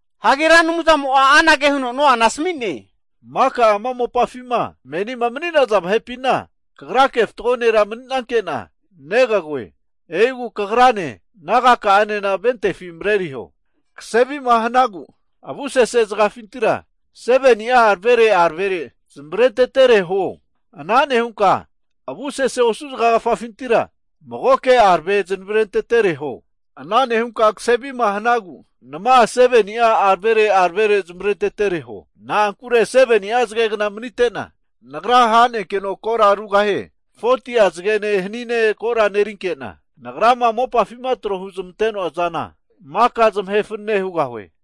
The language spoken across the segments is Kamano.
Hagi Ra Anumzamo'a anage huno Noana asami'ne, Maka ama mopafima menima mani'naza vahepina kagrake fatgo nera mani'nanke'na negagoe. E'igu kagrane nagaka'anena ventefi mareriho. Kase avima hanagu avusese zagagafafintira 7ni'a aravere aravere zamavarentetere huo. Ana nehunka avusese osu zagagafafintira magoke arave zanavrentetere huo. Ana nehunka kase avima hanagu nama 7ni'a aravere aravere zamavarentetere huo. Na'ankure 7ni'a zagegna manite'na Nagra ha'nenkeno kora rugahie. 40'a zagene hanine ko' nerinke'na, Nagrama mopafima trohu zamante'noa zana maka zamahe fanane hugahue.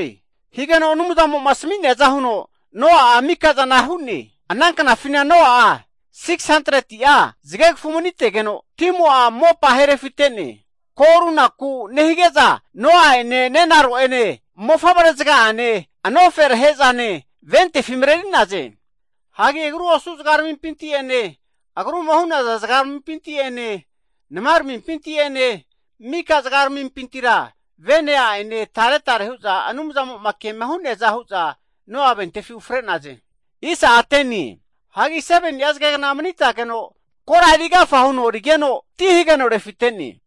Higeno Anumzamo'ma asmi'neaza huno Noa'a mika'zana hu'ne. Ana knafina Noa'a 600'a zagegafu mani'tegeno, timo'a mopa ahe refite'ne. Ko' runaku nehige'za, Noa'ene nenaro'ene, mofavre zaga'ane anoferahe'zane ventefi mareri'naze. Hagi agru osu zagaramimpinti'ene agruma hu'naza zagaramimpinti'ene namaramimpinti'ene, mika zagaramimpintira vene a'ene taretare hu'za Anumzamo'ma kema hu'neaza hu'za Noa'ene ventefi ufre'naze. Hagi 7ni'a zagegna manitageno, kora erigafa huno rigeno, ti hageno refite'ne.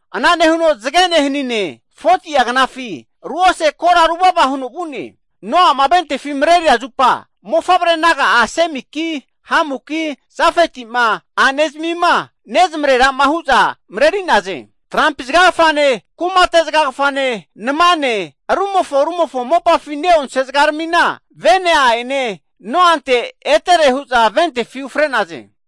Ana nehuno masane, hanine 40'a knafi ruose kora ruvava huno vu'ne. Noa'ma ventefi mareria zupa, mofavre naga'a Semiki, Hamuki, Jafeti'ma a'ne zamima nezmarerama hu'za mareri'naze. Trampi zagagafane, kumate zagagafane, namane, rumofo rumofo mopafi ne'onse zagarmina, vene a'ene Noante etere hu'za ventefi ufre'naze.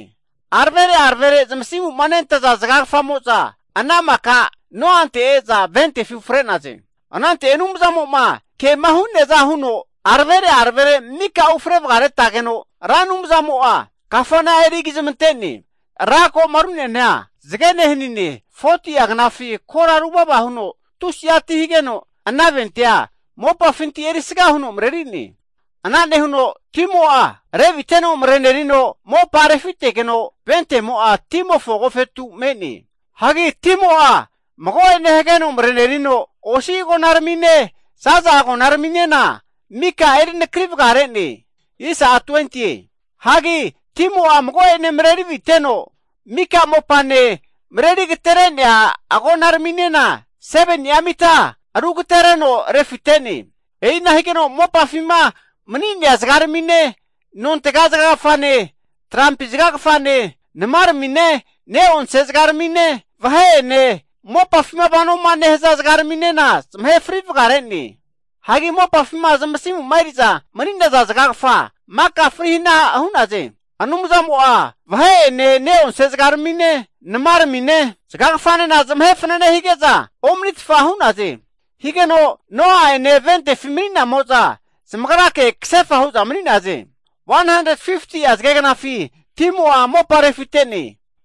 Aravere aravere zamasimu nentaza zagagafamo'za ana maka Noante e'za ventefi ufre'naze. Anante Anumzamo'ma kema hu'neaza huno aravere aravere mika ufre varetageno, Ra Anumzamo'a kafana erigi zamante'ne. Ranko'ma ru'neana zagene hanine 40'a knafi kora ruvava huno tusi'a ti hageno ana ventea mopafinti erisga huno mareri'ne. Ana nehuno timo'a reviteno marenerino mopa refitegeno, ventemo'a timofo agofetu me'ne. Hagi timo'a mago'ene hageno marerino osi agonaramine, zaza agonaraminena mika erinakri vagare'ne. Hagi timo'a mago'ene mareri aviteno, mika mopane mareri agatere'nea agonaraminena 7ni'a mita aru agatereno refite'ne. E'ina higeno mopafima mani'nea zagaramine, nontega zagagafane, trampi zagagafane, namaramine, ne'onse zagarmine, vahe'ene, mopafima vanoma nehaza zagarminena zamahe fri vagare'ne. Hagi mopafima zamasimu eri'za mani'naza zagagafa, maka fri hana hu'naze. Anumzamo'a vahe'ene, ne'onse zagarmine, namaramine, zagagafanena zamahe fanane hige'za omanitfa hu'naze. Higeno Noa'ene ventefi mani'namo'za zamagrake kasefa hu'za mani'naze. Hagi 150'a zagegnafi timo'a mopa refite'ne.